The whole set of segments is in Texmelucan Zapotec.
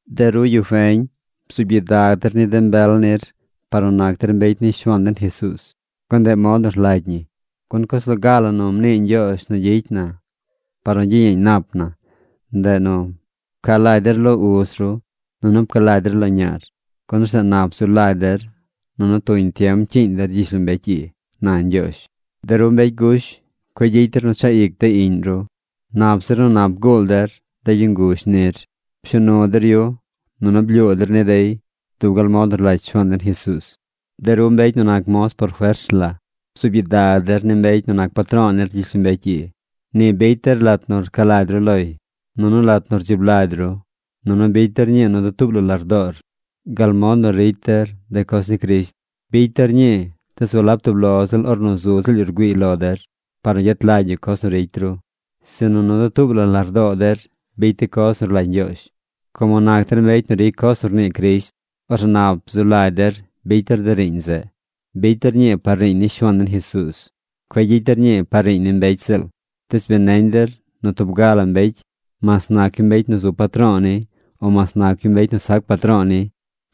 De ru yu feñ, bzuub gyidag der ni de mbel nir par nu nac der mbecy ni Shuaan den Jesuuz, gun ndeꞌ mod nu rlagy ñi. Gun coz loga la nu mnii Ñgyoozh nu gyicy na par nu gyiyeeñ nap na, ndeꞌ nu: “Pca lagy der lo uz ru, nunu pca lagy der lo ñaar, gun orzeꞌ nap zu lagy der nunu tuñ tiem cyiiñ der gyishlombecy ii”, na Ñgyoozh. De ru mbecy gush, cueꞌ gyicy der nu chaꞌ ic de iꞌñ ru. Nap zir nu nap guul der de yu nguzh nir. Pshuu nu der yu, nunu blyuu der ni dey dub gal mod nu rlagy Shuaan den Jesuuz. De ru mbecy nu nac moz por fers la, bzuub gyidag der ni mbecy nu nac patro̱o̱ nir gyishlombecy ii. Ni bicy der lat nu rca lagy ru loy, nunu lat nu rdzib lagy ru. Nunu bicy der ñii nu dutuub la lardoor gal mod nu ricy der de coz ni Crisht. Bicy der ñii, tees walab tub lo ziꞌl ornu zu ziꞌl yu rgüiiy lo der, par nu gyet lagy yu coz nu ricy ru, sinu nu dutuub la lardoo der bicy de coz nu rlagy Ñgyoozh, como nac der mbecy nu ricy coz nu rnii Crisht. Orzeꞌ nap zu lagy der bicy der de riiñ zeꞌ. Bicy der ñii par riiñ ni Shuaan den Jesuuz. Cueꞌ gyicy der ñii par riiñ ni mbecy ziꞌl. Tees bi neñ der nu tub ga la mbecy, mas nac yu mbecy nu zu patro̱o̱ ni, o mas nac yu mbecy nu sac patro̱o̱ ni,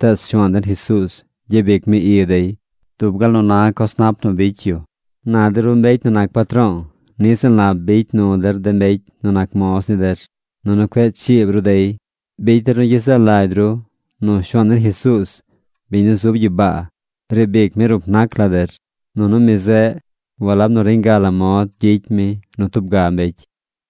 tees Shuaan den Jesuuz gyabic mi i dey dub gal nu na coz nap nu bicy yu. Na de ru mbecy nu nac patro̱o̱, niꞌ ziꞌl nap bicy nu der de mbecy nu nac moz ni der. Nunu cueꞌ chiib ru dey. Bicy der nu gyezaꞌ lagy ru nu Shuaan den Jesuuz, biñ nu zub gyibaa, riib ic mi rup nac la der, nunu mi zeꞌ walab nu reñ ga la mod gyicy mi nu tub ga mbecy.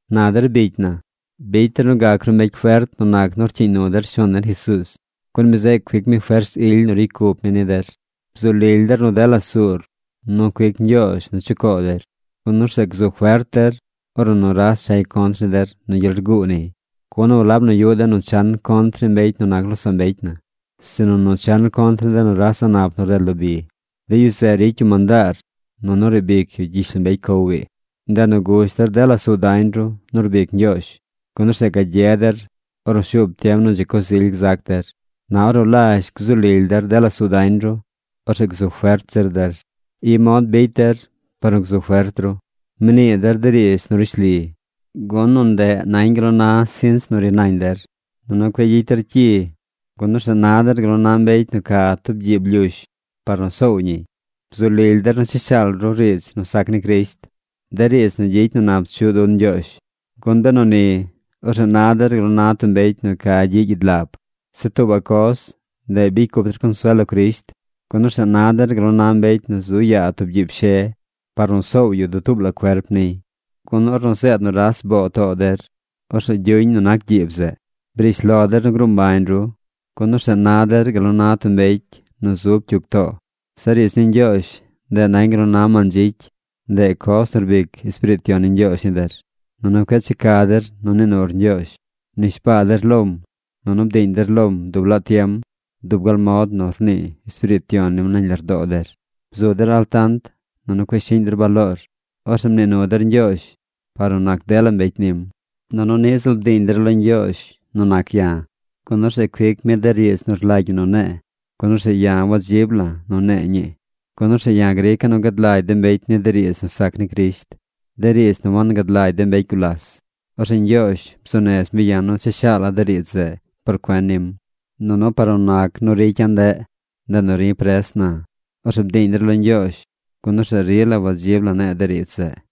Na der bicy na, bicy der nu gac ru mbecy fert nu nac nu rcyiiñ nu der Shuaan den Jesuuz, gun mi zeꞌ cuic mi fers ily nu ricy cup mi ni der. Bzu lily der nu dela suur nu cuic Ñgyoozh nu chucoo der, gun orzeꞌ gzu fert der ornu nuras chay contr ni der nu gyel rguu niy. Gun walab nu yuꞌ den nu chan contr ni mbecy nu nac losaꞌ mbecy na, sinu nu chan contr ni de nuras a̱ꞌ nap nu rded lo bi. De yu zeꞌ ricy yu mandaar nunu riib ic yu gyishlombecy cow ii. Ndeꞌ nu gush der dela suu dañ ru nu rbic Ñgyoozh, gun orzeꞌ gagye der ornu shuub tiem nu dzi coz ily gzac der. Na ornu lazh gzu lily der dela suu dañ ru, orzeꞌ gzu fert zir der. I mod bicy der par nu gzu fert ru. Mnii der de riidz nu rishli, gun nu ndeꞌ nañ gal nu na sinch nu ri nañ der. Nunu cueꞌ gyicy der cyi, gun orzeꞌ na der gal nu na mbecy nu ca tub gyiib lyush par nu soow ñiy. Bzu lily der nu cha shaal ru riidz nu sac ni Crisht, de riidz nu gyicy nu nap chuꞌ dun Ñgyoozh. Gun benu ni, orzeꞌ na der gal nu na tub mbecy nu ca gyiꞌ gyidlab. Zeꞌ tuubaꞌ coz, ndeꞌ bicy cup der consuel lo Crisht, gun orzeꞌ na der gal nu na mbecy nu zu yaa tub gyiib she par nu soow yu dutuub la cuerp niy. Gun, ornu zeed nuras boo too der, orzeꞌ gyuñ nu nac gyiib zeꞌ. Briish lo der nu gruu mbañ ru, gun orzeꞌ na der gal nu na tub mbecy nu zub cyug too. Zeꞌ riidz ni Ñgyoozh, ndeꞌ nañ gal nu na mandzicy. Ndeꞌ coz nu rbic Espiriit Yon ni Ñgyoozh ni der. Nunu cueꞌ checa der nu nii nur Ñgyoozh. Mnishbaa der lom, nunu bdiiñ der lom dub laa tiem dub gal mod nu rnii Espiriit Yon nim nañ lardoo der. Bzu der altant. Nunu cueꞌ shiꞌñ der baloor. Orzeꞌ mnii nu der Ñgyoozh par nu nac dela mbecy nim. Nunu niꞌ ziꞌl bdiiñ der lo Ñgyoozh nu nac ya̱, gun orzeꞌ cuic mi de riidz nu rlagy ñi nu ne̱e̱, gun orzeꞌ ya̱ wadzib la̱ nu ne̱e̱ ñii, gun orzeꞌ ya̱ grica̱ nu gad lagy de mbecy ni de riidz nu sac ni Crisht, de riidz nu wangad lagy de mbecy gulas. Orzeꞌ Ñgyoozh bzuu nez mi ya̱ nu cha shaala̱ de riidz zeꞌ por cuen nim. Nunu par nu nac nu ricya̱ ndeꞌ, ndeꞌ nu ri̱ pres na. Orzeꞌ bdiiñ der lo Ñgyoozh, gun orzeꞌ rila wadzib la ne̱e̱ de riidz zeꞌ.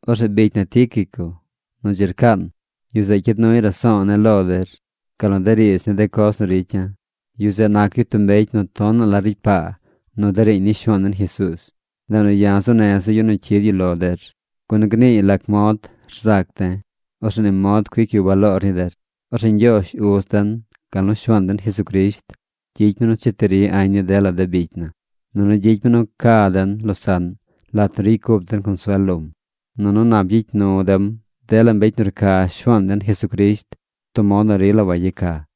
Orzeꞌ bicy na Tíquico nu dzi rcaan, yu zeꞌ cyid nuy raso̱o̱ ne̱ lo der, gal nu de riidz ni de coz nu ricya̱. Yu zeꞌ nac yu tub mbecy nu tonaꞌ la ricy paa nu de riiñ ni Shuaan den Jesuuz. Ndeꞌ nu ya̱ zuu neza̱ yu nu cyid yu lo der, gun gniiy lac mod rzac de̱. Orzeꞌ ni mod cuic yu baloor ni der. Orzeꞌ Ñgyoozh Uz den gal nu Shuaan den Jesucrisht gyicy mi nu cheti ri añ ni dela de bicy na, nunu gyicy mi nu ca den losaꞌn lat nu ricy cup den consuel lom. Nunu nap gyicy nu dem dela mbecy nu rca Shuaan den Jesucrisht tub mod nu rila wayeca.